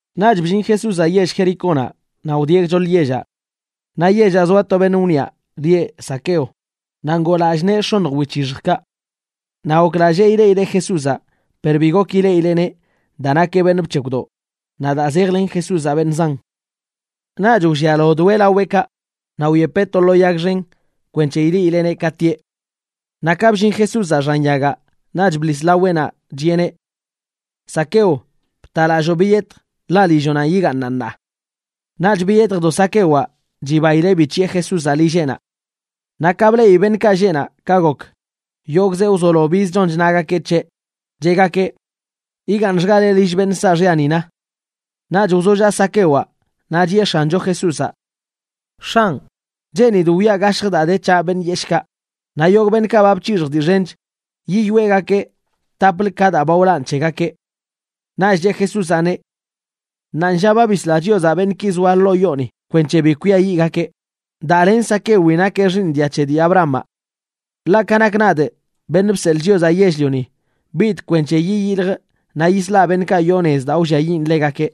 Naꞌch bllin Jesúzaꞌ yell Jericónaꞌ naꞌ wdieꞌ gchoḻ yellaꞌ. Naꞌ yellaꞌ zoa to beṉꞌ wniꞌa lieꞌ Zaqueo, naꞌ ngoo lallꞌ nee x̱oṉj wic̱hixjkaꞌ. Naꞌ goklallee ileꞌileꞌ Jesúzaꞌ, per bi gok ileꞌileꞌneꞌ daa nakeꞌ beṉꞌ bc̱hekwdoꞌ naꞌ daa zejlen Jesúzaꞌ beṉꞌ zan. Naꞌch wllialodoeꞌ laweꞌkaꞌ naꞌ wyepeꞌ to lo yag xen kwenc̱he ileꞌileꞌneꞌ ka tieꞌ. Naꞌ ka bllin Jesúzaꞌ xan yagaꞌ, naꞌ bḻis laweꞌnaꞌ chiꞌeneꞌ: ―Zaqueo, btalalloo biyetj, ḻaꞌ lilloꞌnanꞌ yigaaṉaꞌ ṉaa. Naꞌch biyetjdo Zaquewaꞌ chibaileꞌ bic̱hiꞌe Jesúzaꞌ lilleꞌnaꞌ. Naꞌ ka bleꞌi beṉꞌkaꞌ lleꞌ naꞌ ka gok, yogꞌzeꞌ wzolo biz chon chnagakeꞌ c̱heꞌ, cheꞌgakeꞌ: ―Yigaaṉxgaleꞌ lill beṉꞌ saaxyani, na. Naꞌch wzolla Zaquewaꞌ naꞌ chiꞌe X̱ancho Jesúzaꞌ: ―X̱anꞌ, cheenidꞌ wiꞌa gashjə daa de c̱haꞌ beṉꞌ yeshꞌkaꞌ, naꞌ yogꞌ beṉꞌkaꞌ ba bc̱hixjꞌ dii xench, yiyoeꞌgakee taplə ka daa ba wlanꞌ c̱hegakeꞌ. Naꞌch cheꞌ Jesúzaꞌneꞌ: ―Ṉaanlla ba bisla Chiozaꞌ beṉꞌki zoa ḻoo yooni kwenc̱he bi kwiayiꞌgakeꞌ, daa len Zaquewi nakeꞌ xiiṉ dia c̱he dii Abrahamaꞌ. Ḻaꞌ ka nakꞌ nadꞌ, Beṉꞌ Bseḻꞌ Chiozaꞌ Yell-lioni, bidꞌ kwenc̱he yiyiljꞌ naꞌ yislaꞌ beṉꞌkaꞌ yoo nez daa wlliayiꞌn ḻegakeꞌ.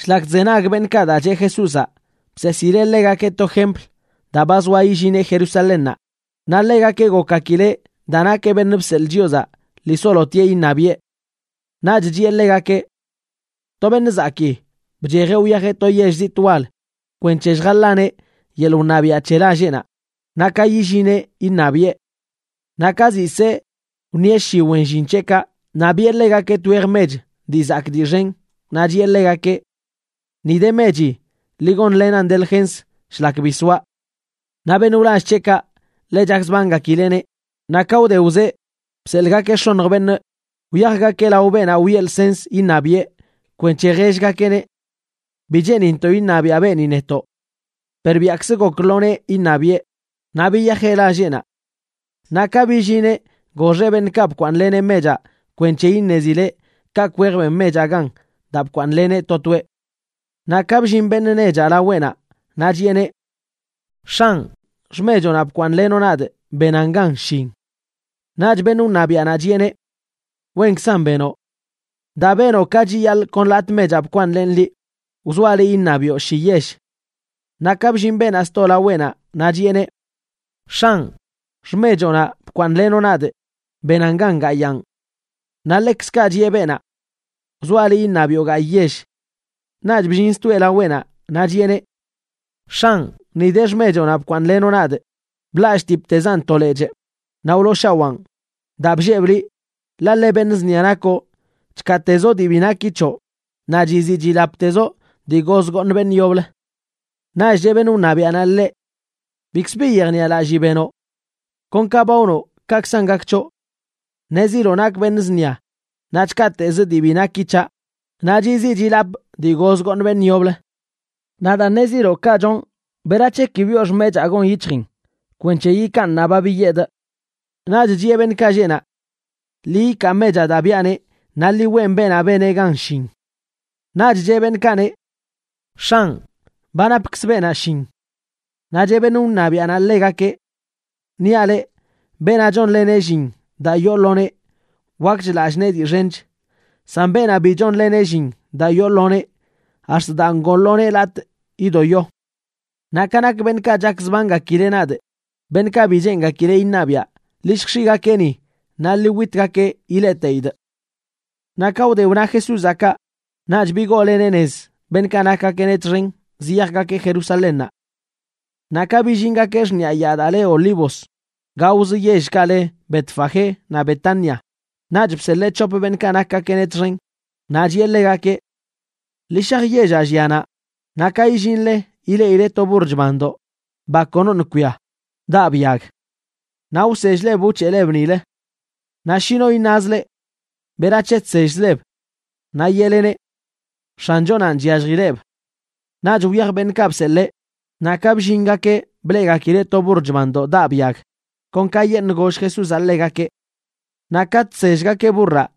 Shlak chzenag beṉꞌkaꞌ daa cheꞌ Jesúzaꞌ, bseesileꞌ ḻegakeꞌ to jempl, daa ba zoa illineꞌ Jerusalénnaꞌ naꞌ ḻegakeꞌ gokgakileꞌ daa nakeꞌ beṉꞌ bseḻꞌ Chiozaꞌ lii solotieꞌ iṉabiꞌe. Naꞌch chiꞌe ḻegakeꞌ: ―To beṉꞌ zakii bchejeꞌ wyajeꞌ to yell zitꞌ wal kwenc̱he lljaḻaneꞌ yeḻꞌ wṉabiaꞌ c̱he lalleꞌnaꞌ, naꞌ ka yillineꞌ iṉabiꞌe. Naꞌ ka ziꞌ see, wṉieꞌ shi wen llin c̱heꞌkaꞌ naꞌ biꞌe ḻegakeꞌ twej mech dii zakꞌ dii xen naꞌ chiꞌe ḻegakeꞌ: “Ni de mechi, ḻi gonlenan delgens shlak bi soaꞌ.” Naꞌ beṉꞌ wlall c̱heꞌkaꞌ ḻe chakzbangakileꞌneꞌ, naꞌ ka wde wzee bseḻꞌgakeꞌ x̱oṉj beṉꞌ wyajgakeꞌ lao beenaꞌ weꞌ lsens iṉabiꞌe kwenc̱he jellgakeꞌneꞌ: “Bi cheenintoꞌ iṉabiaꞌ beeni netoꞌ.” Per biaꞌkzə gok lo nee iṉabiꞌe, naꞌ biyajeꞌ lalleꞌnaꞌ. Naꞌ ka billineꞌ goxeꞌ beṉꞌkaꞌ bkwaaṉleneꞌ mechaꞌ kwenc̱he iṉezileꞌ kaꞌkꞌ wej ben mechaꞌ gan daa bkwaaṉleneꞌ to toeꞌ. Naꞌ ka bllin beṉꞌ nechaꞌ laweꞌnaꞌ naꞌ chiꞌeneꞌ: “X̱anꞌ, xmechoꞌnaꞌ bkwaaṉꞌlenoꞌ nadꞌ benaꞌn gan shin.” Naꞌch beṉꞌ wṉabiaꞌnaꞌ chiꞌeneꞌ: “Wenkzan benoꞌ. Daa benoꞌ ka chiyaḻꞌ kon latꞌ mechaꞌ bkwaaṉlenꞌ liꞌ, wzoaꞌ liꞌ iṉabiꞌo shi yell.” Naꞌ ka bllin beenaꞌ sto laweꞌnaꞌ naꞌ chiꞌeneꞌ: “X̱anꞌ, xmechoꞌnaꞌ bkwaaṉꞌlenoꞌ nadꞌ benaꞌn gan gayaan.” Naꞌ ḻekzkaꞌ chiꞌe beenaꞌ: “Wzoaꞌ liꞌ iṉabiꞌo gayꞌ yell.” Naꞌch bllin stoeꞌ laweꞌnaꞌ naꞌ chiꞌeneꞌ: “X̱anꞌ, ni de xmechoꞌnaꞌ bkwaaṉꞌlenoꞌ nadꞌ. Blallꞌtiptezaꞌn to lechꞌ naꞌ wlooshawaan daa bllebꞌ liꞌ, ḻaꞌ ḻe beṉꞌ zṉia nakoꞌ. Chkaatezoꞌ dii bi naki c̱hoꞌ, naꞌ chiziꞌ chilaptezoꞌ dii goz gooṉ beṉꞌ yoblə.” Naꞌch cheꞌ beṉꞌ wṉabiaꞌnaꞌ ḻeꞌ: “Bikzbi yejniꞌalallii benoꞌ. Kon ka ba wnoꞌ kaꞌkzan gak c̱hoꞌ. Ṉeziloꞌ nakꞌ beṉꞌ zṉia, naꞌ chkaatezꞌ dii bi naki c̱haꞌ naꞌ chiziꞌ chilapꞌ dii goz gooṉ beṉꞌ yoblə. Naꞌ daa ṉeziloꞌ kaꞌ chonꞌ, ¿berac̱he ki biꞌo xmechaa gon yic̱hjin kwenc̱he yikaan ṉaa ba biyedꞌ?” Naꞌch chiꞌe beṉꞌkaꞌ lleꞌ naꞌ: “Ḻi yikaa mechaꞌ daa biꞌaneꞌ naꞌ ḻi weꞌn beenaꞌ beneꞌ gan shin.” Naꞌch cheꞌ beṉꞌkaꞌneꞌ: “X̱anꞌ, ba napkzə beenaꞌ shin.” Naꞌ cheꞌ beṉꞌ wṉabiaꞌnaꞌ ḻegakeꞌ: “Niaꞌ leꞌ, beenaꞌ chonleneꞌ llin daa yoo lo nee, wakch lallꞌ nee dii xench; san beenaꞌ bi chonleneꞌ llin daa yoo lo nee, ax̱t daa ngoo lo nee latꞌ yidoyo. Naꞌ ka nak beṉꞌkaꞌ chakzbangakileꞌ nadꞌ, beṉꞌkaꞌ bi cheengakileꞌ iṉabiꞌa, ḻi lljx̱iꞌgakeꞌ ni naꞌ ḻi witgakeꞌ ileꞌteidꞌ.” Naꞌ ka wde wna Jesúzaꞌ kaꞌ, naꞌch bigooleneꞌ nez beṉꞌkaꞌ nakgakeꞌneꞌ txen ziyajgakeꞌ Jerusalénnaꞌ. Naꞌ ka billingakeꞌ xṉiꞌa yaa daa le Yaa Olivos, gaozə yellkaꞌ le Betfagé naꞌ Betania, naꞌch bseḻee c̱hop beṉꞌkaꞌ nakgakeꞌneꞌ txen, naꞌ chiꞌe ḻegakeꞌ: ―Ḻi shaj yellaꞌ llia naꞌ, naꞌ ka illinle ileꞌile to burr chbandoꞌ, ba konoṉꞌ kwia, daꞌb yag. Naꞌ wsell-leb wc̱heꞌleb nilə. Naꞌ shi no iṉaz leꞌ: “¿Berac̱he chsellzleb?”, naꞌ yeꞌleneꞌ: “X̱anchonanꞌ chyalljileꞌb.” Naꞌch wyaj beṉꞌkaꞌ bseḻee, naꞌ ka bllingakeꞌ bleꞌgakileꞌ to burr chbandoꞌ daꞌb yag, kon kayeṉꞌ goll Jesúzaꞌ ḻegakeꞌ. Naꞌ ka chsellgakeꞌ burraꞌ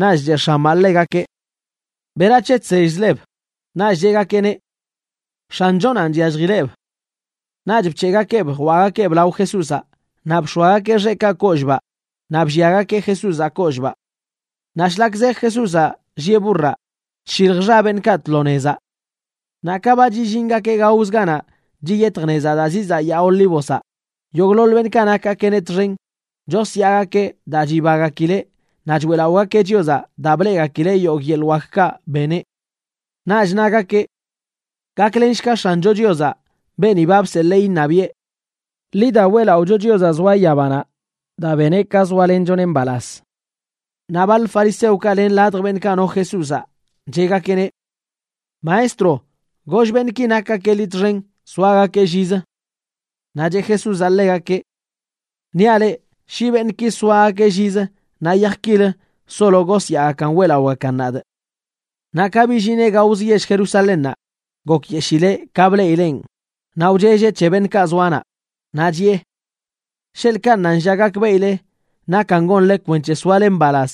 naꞌch cheꞌ x̱amaꞌ ḻegakeꞌ: ―¿Berac̱he chsell-leb? Naꞌch cheꞌgakeꞌneꞌ: ―X̱anchonanꞌ chyalljileꞌb. Naꞌch bc̱heꞌgakeꞌb jwaꞌgakeꞌb lao Jesúzaꞌ naꞌ bx̱oagakeꞌ xeꞌkaꞌ kollꞌbaꞌ naꞌ blliagakeꞌ Jesúzaꞌ kollꞌbaꞌ. Naꞌ shlak zej Jesúzaꞌ llieꞌ burraꞌ, chshilj xa beṉꞌkaꞌ tlo nezaꞌ. Naꞌ ka ba chillingakeꞌ gaozə ganaꞌ chiyetj nez daa zizaꞌ Yaa Olívozaꞌ, yogꞌḻoḻ beṉꞌkaꞌ nakgakeꞌneꞌ txen chosyaagakeꞌ daa chibagakileꞌ naꞌ choeꞌlaꞌogakeꞌ Chiozaꞌ daa bleꞌgakileꞌ yogꞌ yeḻꞌ wakkaꞌ beneꞌ. Naꞌch nagakeꞌ: ―¡Gaklenshga X̱ancho Chiozaꞌ beeni ba bseḻee iṉabiꞌe! ¡Ḻi da, weꞌlaꞌocho Chiozaꞌ zoa yabanaꞌ daa beneꞌ ka zoalenchoneꞌ mbalaz! Naꞌ baḻ fariseokaꞌ len ladj beṉꞌkaꞌ no Jesúzaꞌ, cheꞌgakeꞌneꞌ: ―Maestro, goll beṉꞌki nakgakeꞌ liꞌ txen soagakeꞌ llizə. Naꞌ cheꞌ Jesúzaꞌ ḻegakeꞌ: ―Niaꞌ leꞌ, shi beṉꞌki soagakeꞌ llizə, naꞌ yaj kilə solo gosyaagakan weꞌlaꞌogakan nadꞌ. Naꞌ ka billineꞌ gaozə yell Jerusalénnaꞌ, gokyeshileꞌ ka bleꞌileꞌn naꞌ wchelleꞌ c̱he beṉꞌkaꞌ zoa naꞌ. Naꞌ chiꞌe: ―¡Sheḻꞌkaꞌ ṉaanlla gakbeꞌile nakan gonle kwenc̱he soale mbalaz!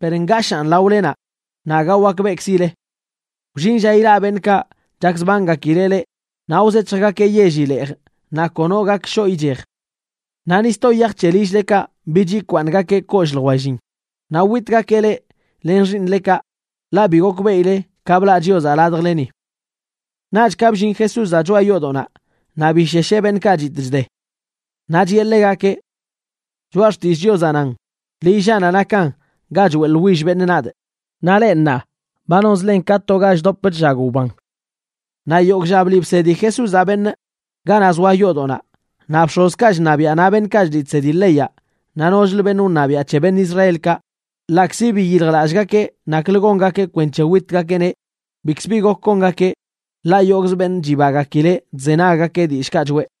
Per ngashaan laolenaꞌ naꞌ aga wakbeꞌkzile. Wllin lla ilaꞌ beṉꞌkaꞌ chakzbangakileꞌ leꞌ naꞌ wzec̱hjgakeꞌ yelli leej naꞌ kono gak shoꞌ ichej. Naꞌ ni sto yaj c̱he lill-lekaꞌ bich yikwaaṉgakeꞌ kollꞌ ljwellin, naꞌ witgakeꞌ leꞌ len xiiṉlekaꞌ, ḻaꞌ bi gokbeꞌile ka blaꞌ Chiozaꞌ ladjleni. Naꞌch ka bllin Jesúzaꞌ choꞌa yoodoꞌnaꞌ naꞌ bishesheꞌ beṉꞌkaꞌ chitꞌ chde. Naꞌ chiꞌe ḻegakeꞌ: ―Choꞌa Xtillꞌ Chiozaꞌ nan: “Lillaꞌnaꞌ nakan ga choeꞌḻwill beṉꞌ nadꞌ”, naꞌ leꞌ ṉaa ba nonzlen ka to ga chdop chllag wban. Naꞌ yogꞌ lla bliꞌ bsedi Jesúzaꞌ beṉꞌ ganaꞌ zoa yoodoꞌnaꞌ, naꞌ bx̱ozkaꞌ chṉabiaꞌ naꞌ beṉꞌkaꞌ chliꞌ chsedi leyaꞌ naꞌ nochlə beṉꞌ wṉabiaꞌ c̱he beṉꞌ Israelkaꞌ ḻaꞌkzi biyiljlallꞌgakeꞌ naklə gongakeꞌ kwenc̱he witgakeꞌneꞌ bikzə bi gok gongakeꞌ, ḻaꞌ yogꞌzə beṉꞌ chibagakileꞌ chzenaggakeꞌ dillꞌkaꞌ choꞌe.